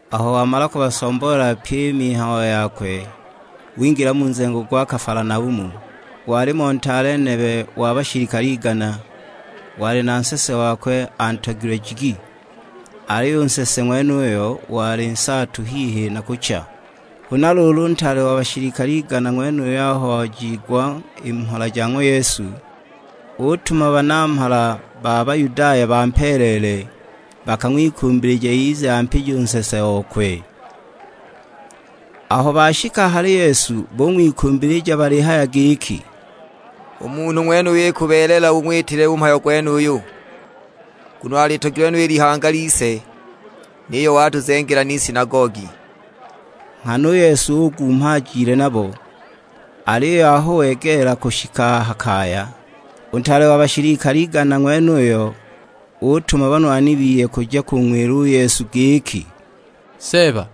Aho wamala kubasomboolela pyi i mihayo yakwe, wingila mu nzengo gwa Kafalanaumu. Walimo ntaale nebe wa bashilikale igana, wali na nsese wakwe antogilwe jigi; aliyo u nsese ng'wenuyo wali nsaatu hihi na kucha. Huna luulu u ntaale wa bashilikale igana ng'wenuyo aho wajiigwa i mhola ja ng'wa Yesu, utuma banamhala ba Bayudaya bampeeleele, bakang'wikumbilije ize ampije u nsese okwe. Aho bashika a hali Yesu bung'wikumbilija balihaya giki, "U munhu ng'wenuyo ikubeelela ung'witile u mhayo gwenuyu. Nguno alitogilwe no i lihanga lise; niyo watuzengela n'isinagogi." Nghana u Yesu ugumha ajile nabo, aliyo aho wegeela kushika a ha kaya, u ntaale wa bashilikale igana ng'wenuyo utuma banwani biye kuja kung'wila u Yesu giki, "Seeba,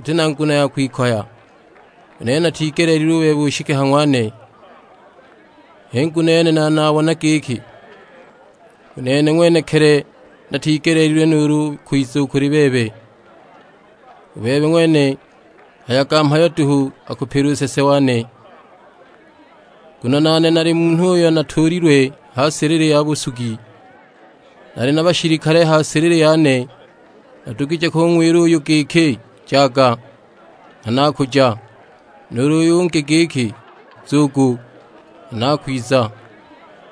uti na nguno ya kwikoya; u nene natigeleelilwe u bebe ushike ha ng'wane. H'i nguno yene naali nabona giki u nene ng'wenekili natigeleelilwe nuulu u kwiza u kuli bebe; u bebe ng'wene hayaga mhayo duhu akupila u nsese wane. Nguno nane nali munhu uyo atuulilwe ha silili ya busugi; nali na bashilikale a ha silili yane. Nadugije kung'wila uyu giki, 'Jaga;' nghana akuja. Nuulu ungi giki, 'Nzugu;' nghana akwiza.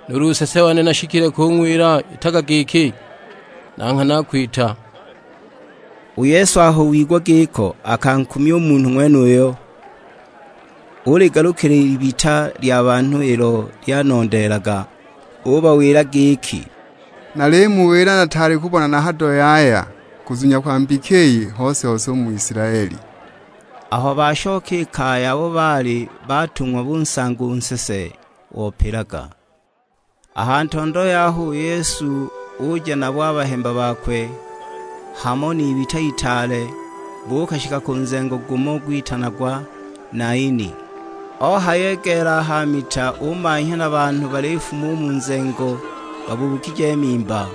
Nuulu nsese wane nashikile kung'wila, 'Itaga giki;' na nghana akwita!" U Yesu aho wigwa giko akankumya u munhu ng'wenuyo, uligalukila i libita lya banhu ilo lyanondeelaga; ubawila giki, "Nalimuwila nataali kubona na hado yaya kuzunya kwa mbika iyi hose-hose u mu Isilaeli." Aho bashoka i kaya abo baali batung'wa busanga u nsese opilaga. A ha ntondo yaho, u Yesu uja nabo a bahemba bakwe, hamo n'ibita itaale, buukashika ku nzengo gumo gwitanagwa Naini. Ohayegeela a ha mita umanhya na banhu balifuma u mu nzengo, babuukije mimba.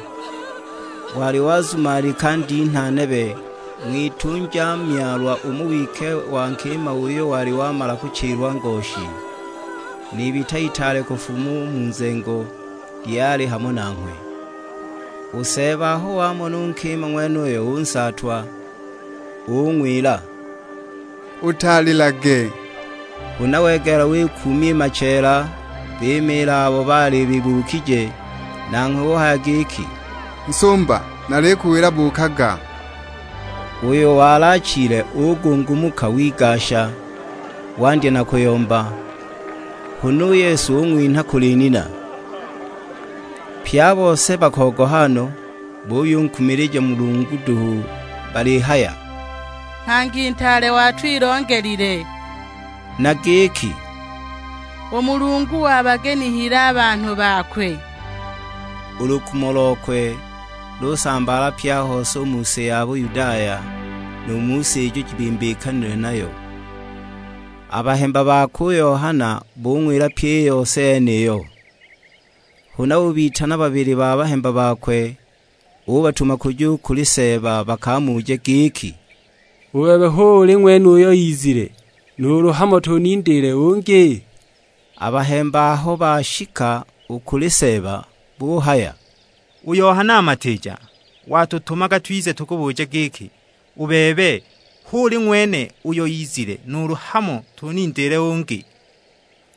Wali wazumalika ndinha nebe, ng'witunja myalwa umo wike wa nkima uyo wali wamala kuchilwa ngoshi; n'ibita itaale kufuma u mu nzengo lyali hamo nanghwe. U Seeba aho wamona u nkima ng'wenuyo unsaatwa; ung'wila, "Utalilage!" Huna wegeela wikuumya i macheela, bimiila abo baali bibuukije; nanghwe uhaya giki, "Nsumba nalikuwila buukaga!" Uyo wali achile ugungumuka wigasha, wandya na kuyomba; huna u Yesu ung'winha kuli nina. Pye a bose bakogoha no, buyunkumilija Mulungu duhu balihaya, "Nghangi ntaale watwilongelile." Na giki, "U Mulungu wabagenihile a banhu bakwe." U lukumo lokwe lusambaala pye a hose u mu si ya Buyudaya, nu mu si ijo jibimbikanilwe nayo. A bahemba bakwe u Yohana bung'wila pyi i yose yeniyo. Huna ubitana babili ba bahemba bakwe, ubatuma kuja u kuli Seeba bakamuje giki, "U bebe hu uli ng'wene uyo izile, nuulu hamo tunindiile ungi?" A bahemba aho bashika u kuli Seeba buhaya, "U Yohana Matiija watutumaga twize tukubuje giki, 'U bebe, hu uli ng'wene uyo izile, nuulu hamo tunindiile ungi?' "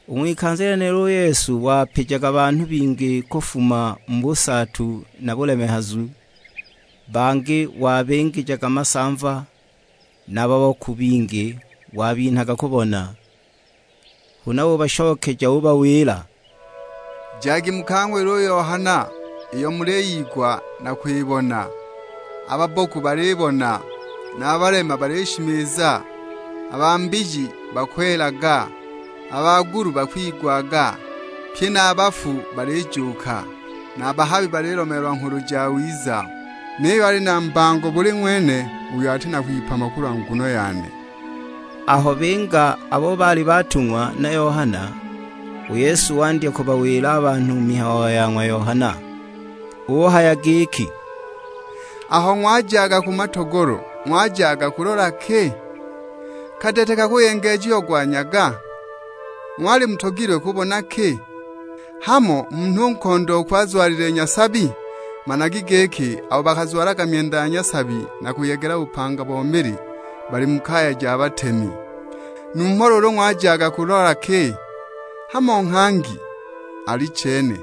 U ng'wikanza lyenilo u Yesu wapijaga banhu bingi kufuma mu busaatu na bulemehazu; bangi wabingijaga masamva, na babboku bingi wabinhaga kubona. Huna ubashokeja ubawila, "Jagi mukang'wile u Yohana iyo muliyigwa na kwibona: a babboku balibona, na a balema balishimiza, a ba mbiji bakwelaga, a bagulu bakwigwaga; pye na a bafu balijuuka, na a bahabi balilomeelwa Nghulu Jawiza. Niyo ali na mbango buli ng'wene uyo ati na kwipama kulwa nguno yane." Aho binga abo baali batung'wa na Yohana, u Yesu wandya kubawila a banhu mihayo ya ng'wa Yohana. Uhaya giki, "Aho ng'wajaga ku matogolo, ng'wajaga kujulola ki? Kadete kakuyengejiagwa nyaga? Ng'wali mutogilwe kubona ki? Hamo munhu nkondooku azwalilile nyasabi? Managi giki abo bakazwalaga myenda ya nyasabi na kuyegela bupanga bo mili, bali mu kaya ja batemi. Numho luulu ng'wajaga kulola ki? Hamo nghangi? Alichene,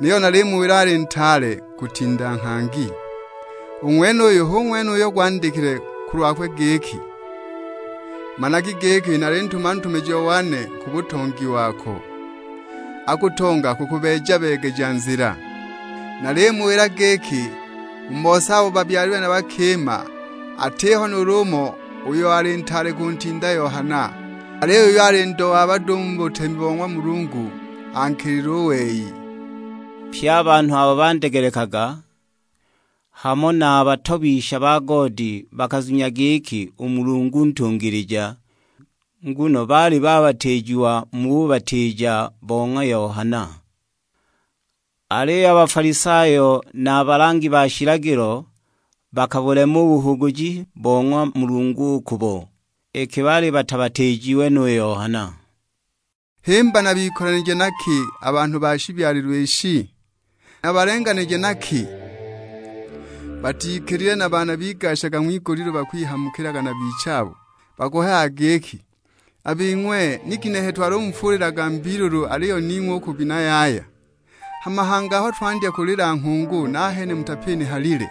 niyo nalimuwila ali ntaale kutinda nghangi. U ng'wenuyu hu ng'wene uyo gwandikilwe kulwakwe giki, 'Managa giki nalintuma ntumijiwa wane ku butongi wako, akutonga kukubeeja-beegeja nzila.' Nalimuwila giki u mu bose abo babyalilwe na bakima, atiho nuulu umo uyo ali ntaale kuntinda Yohana. Aliyo uyo ali ndo wa bado u mu butemi bo ng'wa Mulungu ankilile u wei." (Pye a banhu abo bandegelekaga, hamo na a batobisha ba goodi bakazunya giki u Mulungu ntungilija; nguno baali babatiijiwa mu bubatiija bo ng'wa Yohana. Aliyo a Bafalisayo na a balangi ba shilagilo, bakabulema u buhuguji bo ng'wa Mulungu u kubo, iki baali batabatiijiwe nu Yohana.) "Himba nabikolanije na ki a banhu ba shibyalilwe ishi? Nabalenganije na ki? Batikilile na baana bigashaga ng'wigulilu bakwihamukilaga na bichabo; bakuhayaga giki, 'A bing'we, ni ginehe twalumufuulilaga mbiilulu aliyo ning'we u kubina yaya; hama hangi aho twandya kulila nghungu nahene mutapinihalile!'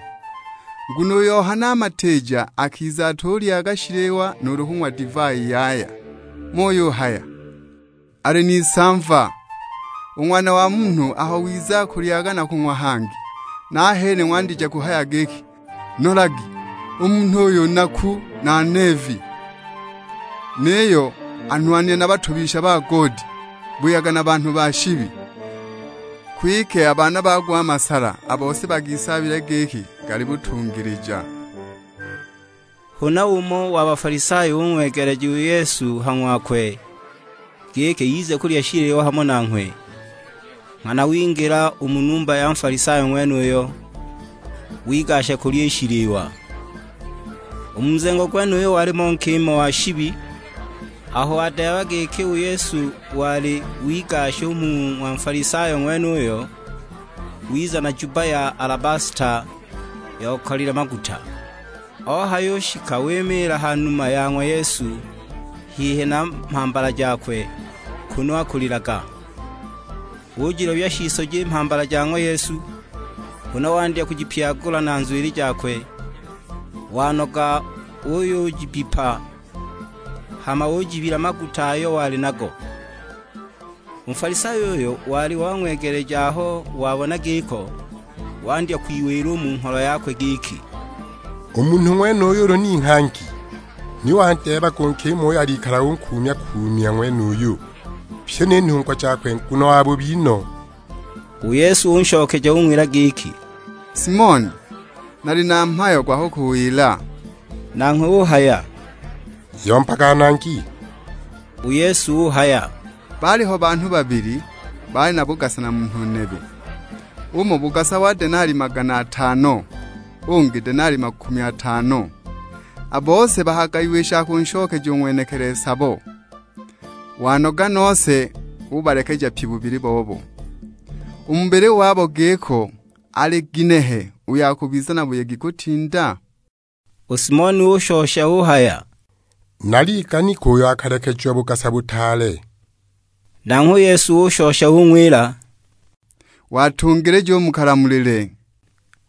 Nguno u Yohana Matiija akiza atulyaga shiliwa nuulu kung'wa divai yaya; muyuhaya, 'Ali n'isamva!' U Ng'wana wa Munhu aho wiza akulyaga na kung'wa hangi, nahene ng'wandije kuhaya giki, 'Nolagi u munhu uyu; naku na neevi, niyo anwanile na batobisha ba goodi, buyaga na banhu ba shibi!' Kwike a baana bago a masala, a bose bagisaabile giki gali butungilija." Huna umo wa Bafalisayo ung'wegeleja u Yesu ha ng'wakwe, giki ize kulya shiliwa hamo nanghwe; nghana wingila u mu numba ya Nfalisayo ng'wenuyo, wigasha kulya i shiliwa. U mu nzengo gwenuyo walimo nkima wa shibi; aho wadeeba giki u Yesu wali wigasha u mu ng'wa Nfalisayo ng'wenuyo, wiza na jubba ya alabasta yokalile maguta. Ohayushika wimiila ha numa ya ng'wa Yesu, hihi na mhambala jakwe, kunu akulilaga. Ujilobya shisoji i mhambala ja ng'wa Yesu, huna wandya kujipyagula na nzwili jakwe; wanoga uyujibbipa, hama ujibila maguta ayo wali nago. U Nfalisayo uyo wali wang'wegeleja aho wabona giko, wandya kwiwila u mu ngholo yakwe giki, "U munhu ng'wenuyu ulu ni nghangi, ni wandeebaga u nkima uyo alikala unkuumya-kuumya ng'wenuyu, pyi ni nhungwa jakwe; nguno wabubi no!" U Yesu unshokeja ung'wila giki, "Simoni, nali na mhayo gwa kukuwila." Nanghwe uhaya, "Yombaga Nangi." U Yesu uhaya, "Baaliho banhu babili, baali na bugasa na munhu nebe. Umo bugasa bo denali magana atano, ungi denali makumi atano. A bose bakagayiwa i sha kunshokeja u ng'wenekili sabo, wanoga nose ubalekeja pyi bubili wabo. U mu bubili wabo giko, ali kinehe uyo akubiza na buyegi kutinda?" U Simoni ushosha uhaya, "Naliganika uyo akalekejiwa bugasa butaale." Nanghwe u Yesu ushosha ung'wila, "Watungilija u mu kalamulile."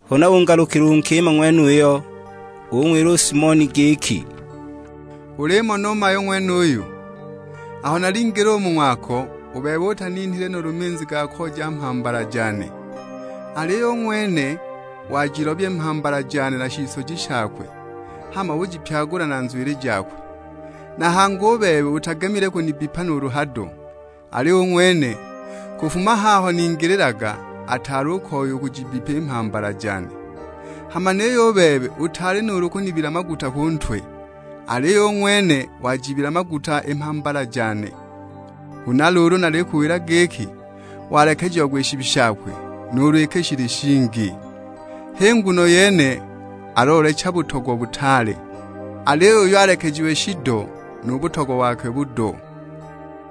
Huna ungalukila u nkima ng'wenuyo, ung'wila u Simoni giki, "Ulimona u mayu ng'wenuyu? Aho nalingila u mu ng'wako, u bebe utaninhile nuulu minzi ga kooja mhambala jane, aliyo u ng'wene wajilobya i mhambala jane na shisoji shakwe, hama ujipyagula na nzwili jakwe. Na hangi u bebe utagemile kunibbipa nuulu hado. Aliyo u ng'wene, kufuma haho ningililaga, ataali u koya u kujibbipa i mhambala jane. Hama niyo u bebe utaali nuulu kunibila maguta ku ntwe, aliyo u ng'wene wajibila maguta i mhambala jane. Huna luulu nalikuwila giki, walekejiagwa i shibi shakwe nuulu iki shili shingi, h'i nguno yene aloolecha butogwa butaale, aliyo uyo alekejiwe shido, nu butogwa bokwe budo."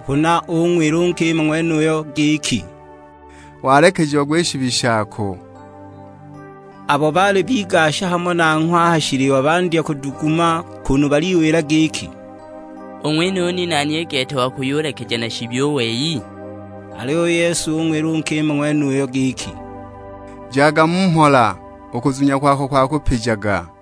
Huna ung'wila u nkima ng'wenuyo giki, "Walekejiagwa i shibi shako!" Abo baali bigasha nanghwe a ha shiliwa bandya kuduguma kunu baliwila giki, "U ng'wenuyu ni nani i gete wa kuyulekeja na shibi u wei?" Aliyo u Yesu ung'wila u nkima ng'wenuyo giki, "Jaga mu mhola, u kuzunya kwako kwakupijaga."